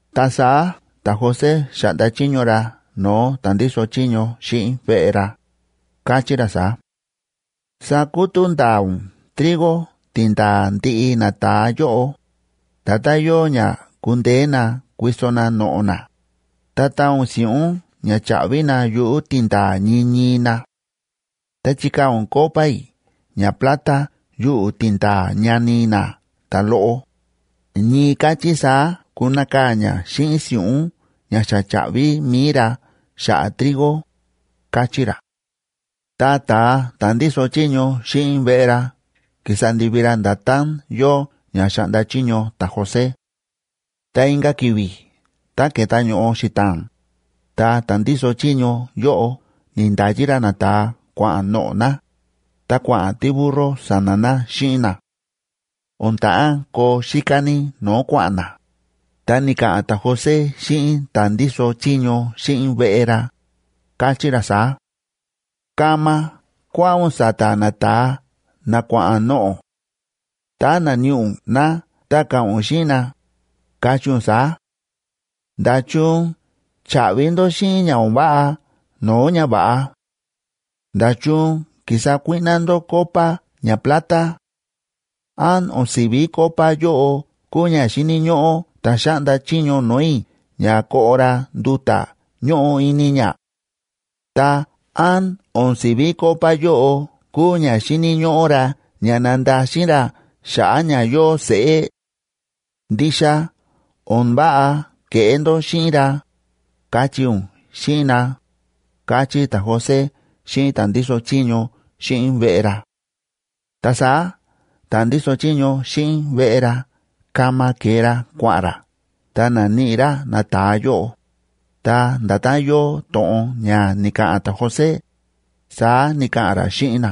Ta saá ta̱José xa̱ꞌnda chiño ra no̱o̱ ta̱ ndíso chiño xíꞌin veꞌe ra, káchí ra saá: ―Sakutú ndaa ún trigo tindaa̱ ndiꞌi nata̱a yóꞌo, nda̱tán yóo ña kundeé na kuiso na noꞌo̱ na, ta taan ún si̱ꞌún ña cha̱ꞌvi na yuꞌu̱ tindaa̱ ñii ñii na. Ta chikaa̱ ún copa i̱ ñaplata yuꞌu̱ tindaa̱ ñani na ta̱loꞌo, ñii káchí saá kunakaa̱ ña xíꞌin si̱ꞌún ña xa cha̱ꞌvi mi̱i ra xa̱ꞌa̱ trigo ―káchí ra. Ta ta̱a ta̱ ndíso chiño xíꞌin veꞌe ra ki̱sa ndivi ra nda̱tán yóo ña xa̱ꞌnda chiño ta̱José. Ta inka̱ ki̱vi̱ tá ke̱ta ño̱ꞌo xita̱a̱n, ta ta̱ ndíso chiño yóꞌo ni̱nda̱yi ra nata̱a kua̱ꞌa̱n noꞌo̱ na, ta kua̱ꞌa̱n tíburro sa̱na̱ na xíꞌin na. O̱n ta̱ꞌán koo xíká ní no̱o̱ kua̱ꞌa̱n na, ta ni̱ka̱ꞌa̱n ta̱José xíꞌin ta̱ ndíso chiño xíꞌin veꞌe ra, káchí ra saá: ―Kama kuáꞌa̱n ún sa̱ta̱ nata̱a na kua̱ꞌa̱n noꞌo̱; tá naníꞌi ún na ta ka̱ꞌa̱n ún xíꞌin na, kachí ún saá: “¿Nda̱chun cha̱ꞌvi ndó xíꞌin ña o̱n váꞌa no̱o̱ ñava̱ꞌa? ¿Nda̱chun ki̱sa kuíꞌná ndó copa ñaplata? ¿Án o̱n si̱ví copa yóꞌo kúu ña xíni̱ ñóꞌó ta̱ xáꞌnda chiño no̱o̱ i̱ ña koꞌo ra nduta̱ ñóꞌo ini ña? Ta, ¿án o̱n si̱ví copa yóꞌo kúu ña xíni̱ ñóꞌó ra ña nandaxin ra xa̱ꞌa̱ ña yóo seꞌé? Ndixa o̱n váꞌa ke̱ꞌé ndó xíꞌin ra”, kachí ún xíꞌin na ―káchí ta̱José xíꞌin ta̱ ndíso chiño xíꞌin veꞌe ra. Ta saá ta̱ ndíso chiño xíꞌin veꞌe ra kama ke̱e ra kua̱ꞌa̱n ra ta na̱níꞌi ra nata̱a yóꞌo, ta nda̱tán yóo to̱ꞌon ña ni̱ka̱ꞌa̱n ta̱José, saá ni̱ka̱ꞌa̱n ra xíꞌin na.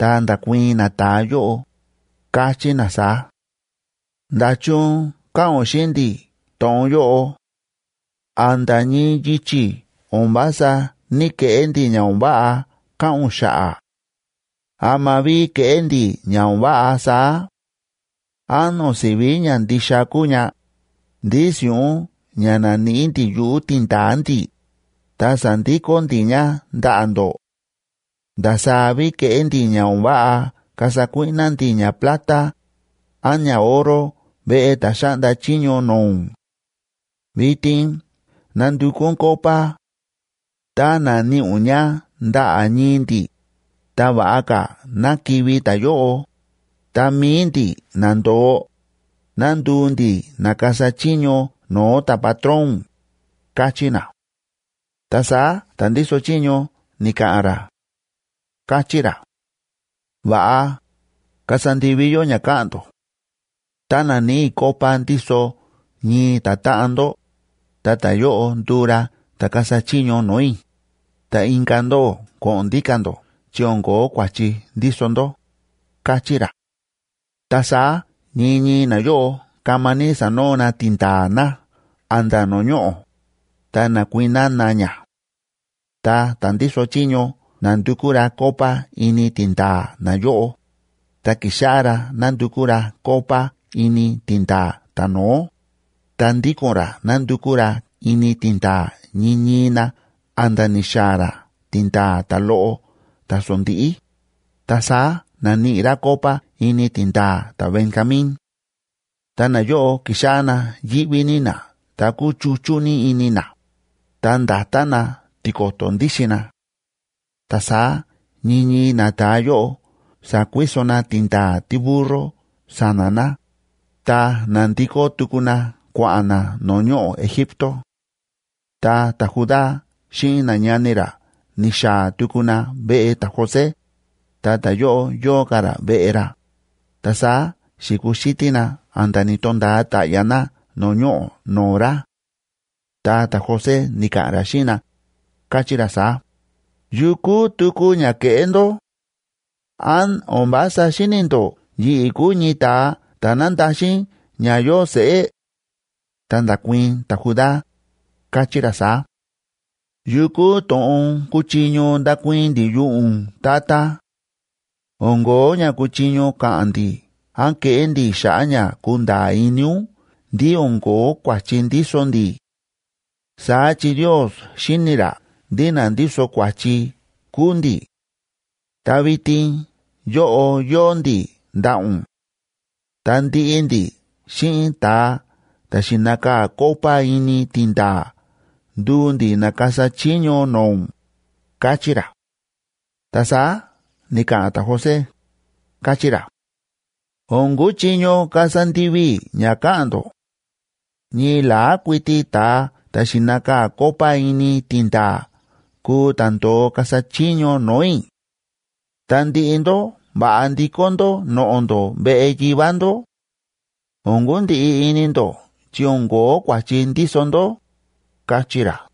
Ta nda̱kuii̱n nata̱a yóꞌo, káchí na saá: ―¿Nda̱chun káꞌa̱n ún xíꞌin ndi̱ to̱ꞌon yóꞌo? A̱nda̱ ñii yichi̱ o̱n vása ní‑keꞌé ndi̱ ña o̱n váꞌa káꞌa̱n ún xa̱ꞌa̱. ¿Ama ví keꞌé ndi̱ ña o̱n váꞌa saá? ¿Án o̱n si̱ví ñandixa kúu ña, ndí si̱ꞌún ña na̱níꞌi ndi̱ yuꞌu̱ tindaa̱ ndi̱, ta sa̱ndikó ndi̱ ña ndaꞌa̱ ndó? ¿Ndasaá ví keꞌé ndi̱ ña o̱n váꞌa kasa kuíꞌná ndi̱ ñaplata án ñaoro veꞌe ta̱ xáꞌnda chiño no̱o̱ ún? Vitin nandukú ún copa; tá naníꞌi ún ña ndaꞌa̱ ñii ndi̱, ta va̱ꞌa ka̱ ná kivi̱ ta̱yóꞌo, ta mi̱i ndi̱ na ndo̱o, ná nduu ndi̱ na kasa chiño no̱o̱ ta̱patrón ún ―káchí na. Ta saá ta̱ ndíso chiño ni̱ka̱ꞌa̱n ra, káchí ra: ―Va̱ꞌa, kasa ndivi yó ña káꞌa̱n ndó. Tá naníꞌi i̱ copa ndíso ñii ta̱táꞌan ndó, ta ta̱yóꞌo nduu ra ta̱ kasa chiño no̱o̱ i̱, ta inka̱ ndóꞌó ko̱ꞌo̱n ndíka̱ ndó chi o̱n ko̱ó kua̱chi ndíso ndó ―káchí ra. Ta saá ñii ñii nayóꞌo kama ní sa̱noo na tindaa̱ na a̱nda̱ no̱o̱ ñoꞌo̱, ta na̱kuiná na ña. Ta ta̱ ndíso chiño na̱ndukú ra copa ini tindaa̱ nayóꞌo, ta ki̱xáꞌá ra nándukú ra copa ini tindaa̱ ta̱no̱ó, ta ndíko̱n ra nándukú ra ini tindaa̱ ñii ñii na a̱nda̱ ni̱xaa̱ ra tindaa̱ ta̱loꞌo ta̱sondíꞌí, ta saá na̱níꞌi ra copa ini tindaa̱ ta̱Benjamín. Ta nayóꞌo ki̱xáꞌá na yíꞌví ní na ta kúchuchú ní ini na, ta nda̱ta na tiko̱to̱ ndíxin na. Ta saá ñii ñii nata̱a yóꞌo sa̱kuiso na tindaa̱ tíburro sa̱na̱ na ta na̱ndikó tuku na kua̱ꞌa̱n na no̱o̱ ñoꞌo̱ Egipto. Tá ta̱Judá xíꞌin nañani ra ni̱xaa̱ tuku na veꞌe ta̱José, ta ta̱yóꞌo yóo ka̱ ra veꞌe ra, ta saá xi̱kuxítí na a̱nda̱ ni̱to̱nda̱a ta̱ꞌya̱ na no̱o̱ ñoꞌo̱ no̱o̱ ra. Ta ta̱José ni̱ka̱ꞌa̱n ra xíꞌin na, káchí ra saá: ―¿Yu kúu tuku ña ke̱ꞌé ndó? ¿Án o̱n vása xíni̱ ndó yi̱ꞌi̱ kúu ñii ta̱a ta̱ nándaxin ña yóo seꞌé? Ta nda̱kuii̱n ta̱Judá, káchí ra saá: ―¿Yu kúu to̱ꞌon kuchiño ndakuii̱n ndi̱ yuꞌu̱ ún, tata? O̱n ko̱ó ña kuchiño ka̱ꞌa̱n ndi̱ án keꞌé ndi̱ xa̱ꞌa̱ ña kunda̱a̱ ini ún ndí o̱n ko̱ó kua̱chi ndíso ndi̱. Saá chi Ndios xíni̱ ra ndí na ndíso kua̱chi kúu ndi̱. Ta vitin yóꞌo yóo ndi̱ ndaꞌa̱ ún; ta ndiꞌi ndi̱ xíꞌin ta̱a ta̱ xi̱nakaa̱ copa ini tindaa̱ nduu ndi̱ na kasa chiño no̱o̱ ún ―káchí ra. Ta saá ni̱ka̱ꞌa̱n ta̱José, káchí ra: ―O̱n kuchiño kasa ndivi i̱ ña káꞌa̱n ndó. Ñii la̱á kuiti ta̱a ta̱ xi̱nakaa̱ copa ini tindaa̱ kuu ta̱ ndo̱o kasa chiño no̱o̱ i̱. Ta ndiꞌi ndó va̱ꞌa ndikó ndó noꞌo̱ ndó veꞌe yivá ndó. O̱n kundiꞌi ini ndó chi o̱n ko̱ó kua̱chi ndíso ndó ―káchí ra.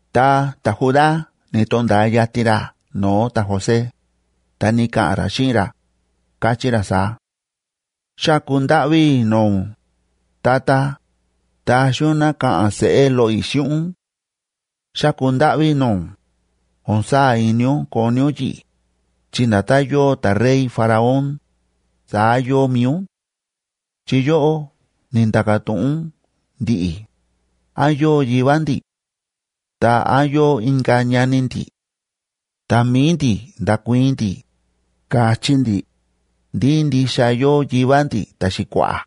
Ta ta̱Judá ni̱to̱nda̱a yatin ra no̱o̱ ta̱José, ta ni̱ka̱ꞌa̱n ra xíꞌin ra, káchí ra saá: ―Xáku ndáꞌví i̱ no̱o̱ ún, tata, taxi ún ná ka̱ꞌa̱n seꞌé loꞌo i̱ xíꞌin ún. Xáku ndáꞌví i̱ no̱o̱ ún, o̱n saa̱ ini ún koni ún yi̱ꞌi̱, chi nda̱tán yóo ta̱rey Faraón, saá yóo mi̱i ún. Chi yóꞌó ni̱nda̱ka̱ to̱ꞌon ún ndi̱ꞌi̱, ¿án yóo yivá ndi̱?, ta, ¿án yóo inka̱ ñani ndi̱? Ta mi̱i ndi̱ nda̱kuii̱n ndi̱, ka̱chí ndi̱, ndí ndixa yóo yivá ndi̱ ta̱xi̱kua̱ꞌa̱,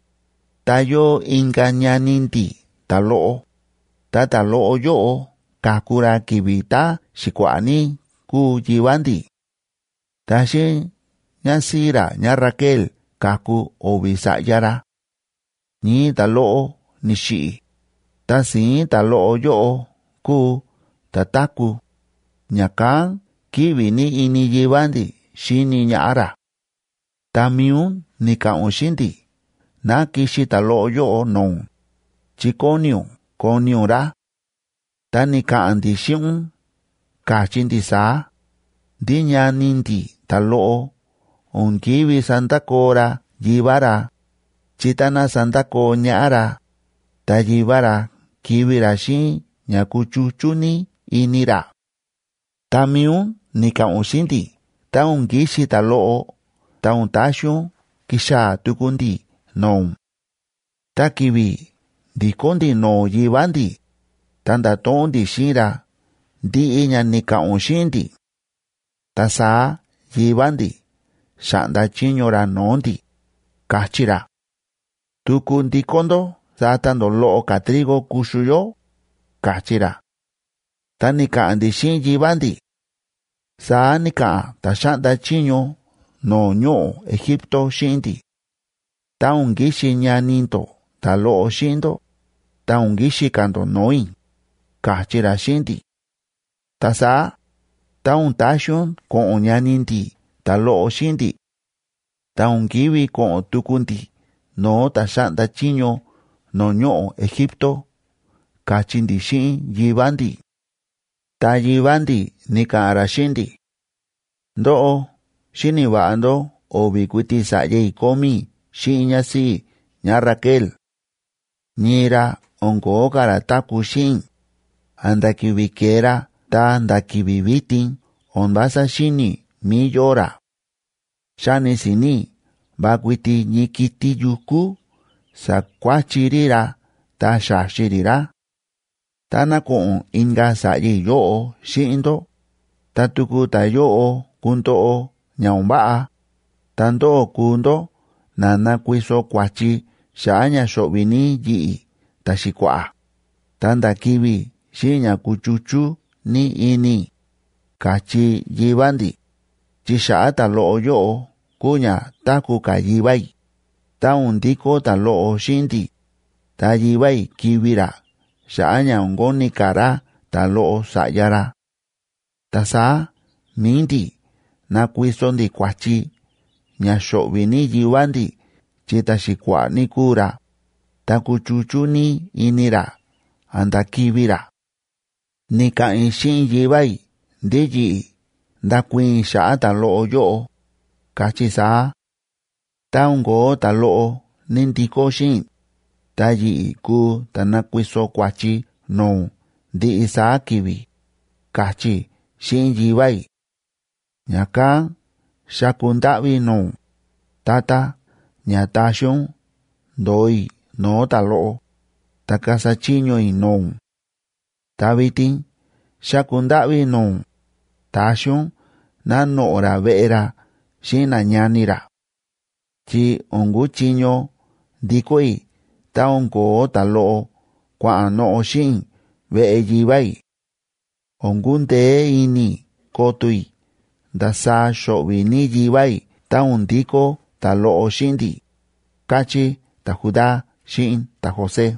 ta yóo inka̱ ñani ndi̱ ta̱loꞌo, ta ta̱loꞌo yóꞌo ka̱ku ra ki̱vi̱ tá ta̱xi̱kua̱ꞌa̱ ní kúu yivá ndi̱. Ta xíꞌin ñásíꞌí ra ñáRaquel ka̱ku o̱vi̱ sa̱ꞌya ra. Ñii ta̱loꞌo ni̱xiꞌi̱, ta si̱ín ta̱loꞌo yóꞌo kúu ta̱ táku̱, ña̱kán kíꞌvi ní ini yivá ndi̱ xíni ñaꞌá ra. Ta mi̱i ún ni̱ka̱ꞌa̱n ún xíꞌin ndi̱ ná kixi ta̱loꞌo yóꞌo no̱o̱ ún, chi kóni ún koni ún ra. Ta ni̱ka̱ꞌa̱n ndi̱ xíꞌin ún ka̱chí ndi̱ saá, ndí ñani ndi̱ ta̱loꞌo o̱n ki̱ví sandakoo ra yivá ra, chi táná sandakoo ñaꞌá ra, ta yivá ra kivi̱ ra xíꞌin ña kuchuchú ní ini ra. Ta mi̱i ún ni̱ka̱ꞌa̱n ún xíꞌin ndi̱ tá o̱n kixi ta̱loꞌo ta o̱n taxi ún kixaa̱ tuku ndi̱ no̱o̱ ún. ’Ta ki̱vi̱ ndi̱kó ndi̱ no̱o̱ yivá ndi̱, ta nda̱to̱ꞌon ndi̱ xíꞌin ra ndiꞌi ña ni̱ka̱ꞌa̱n ún xíꞌin ndi̱. Ta saá yivá ndi̱ xa̱ꞌnda chiño ra no̱o̱ ndi̱, ka̱chí ra: “Tuku ndikó ndó sata ndó loꞌo ka̱ trigo kuxu yó”, ka̱chí ra. Ta ni̱ka̱ꞌa̱n ndi̱ xíꞌin yivá ndi̱: “Saá ni̱ka̱ꞌa̱n ta̱ xáꞌnda chiño no̱o̱ ñoꞌo̱ Egipto xíꞌin ndi̱: Tá o̱n kixi ñani ndó ta̱loꞌo xíꞌin ndó, ta o̱n kixi ka̱ ndó no̱o̱ i̱, ka̱chí ra xíꞌin ndi̱. Ta saá, tá o̱n taxi ún ko̱ꞌo̱n ñani ndi̱ ta̱loꞌo xíꞌin ndi̱, ta o̱n kívi ko̱ꞌo̱n tuku ndi̱ no̱o̱ ta̱ xáꞌnda chiño no̱o̱ ñoꞌo̱ Egipto”, ka̱chí ndi̱ xíꞌin yivá ndi̱. Ta yivá ndi̱ ni̱ka̱ꞌa̱n ra xíꞌin ndi̱: “Ndóꞌó xíni̱ va̱ꞌa ndó o̱vi̱ kuiti sa̱ꞌya i̱ kómí i̱ xíꞌin ñásíꞌí i̱ ñáRaquel; ñii ra o̱n ko̱ó ka̱ ra táku̱ xíꞌin i̱, a̱nda̱ ki̱vi̱ ke̱e ra ta̱nda̱ ki̱vi̱ vitin o̱n vása xíni̱ i̱ mí yóo ra. Xáni si̱ni̱ i̱ va kuiti ñii kiti̱ yukú sa̱kuáchi rí ra ta xa̱xi rí ra. Táná ko̱ꞌo̱n inka̱ sa̱ꞌya i̱ yóꞌo xíꞌin ndó, tá tuku ta̱yóꞌo kundoꞌo ña o̱n váꞌa, ta ndóꞌó kuu ndó na nakuiso kua̱chi xa̱ꞌa̱ ña xo̱ꞌvi̱ ní yi̱ꞌi̱ ta̱xi̱kua̱ꞌa̱, ta̱nda̱ kivi̱ i̱ xíꞌin ña kuchuchú ní ini i̱”, ka̱chí yivá ndi̱. ’Chi xa̱ꞌa̱ ta̱loꞌo yóꞌo kúu ña táku̱ ka̱ yivá i̱, tá o̱n ndikó ta̱loꞌo xíꞌin ndi̱, ta yivá i̱ kivi̱ ra xa̱ꞌa̱ ña o̱n koni ka̱ ra ta̱loꞌo sa̱ꞌya ra. Ta saá mi̱i ndi̱ nakuiso ndi̱ kua̱chi ña xo̱ꞌvi̱ ní yivá ndi̱ chi ta̱xi̱kua̱ꞌa̱ ní kúu ra, ta kuchuchú ní ini ra a̱nda̱ kivi̱ ra. Ni̱ka̱ꞌa̱n i̱ xíꞌin yivá i̱ ndí yi̱ꞌi̱ ndakuii̱n i̱ xa̱ꞌa̱ ta̱loꞌo yóꞌo, ka̱chí i̱ saá: “Tá o̱n kóo ta̱loꞌo ní ndikó xíꞌin i̱, ta yi̱ꞌi̱ kuu ta̱ nakuiso kua̱chi no̱o̱ ún ndiꞌi saá ki̱vi̱”, ka̱chí i̱ xíꞌin yivá i̱. Ña̱kán xáku ndáꞌví i̱ no̱o̱ ún, tata, ña taxi ún ndo̱o i̱ no̱o̱ ta̱loꞌo, ta kasa chiño i̱ no̱o̱ ún. Ta vitin xáku ndáꞌví i̱ no̱o̱ ún, taxi ún ná noꞌo̱ ra veꞌe ra xíꞌin nañani ra. Chi o̱n kuchiño ndikó i̱ tá o̱n ko̱ó ta̱loꞌo kua̱ꞌa̱n noꞌo̱ xíꞌin i̱ veꞌe yivá i̱. O̱n kundeé ini i̱ koto i̱ ndasaá xo̱ꞌvi̱ ní yivá i̱ tá o̱n ndikó ta̱loꞌo xíꞌin ndi̱ ―káchí ta̱Judá xíꞌin ta̱José.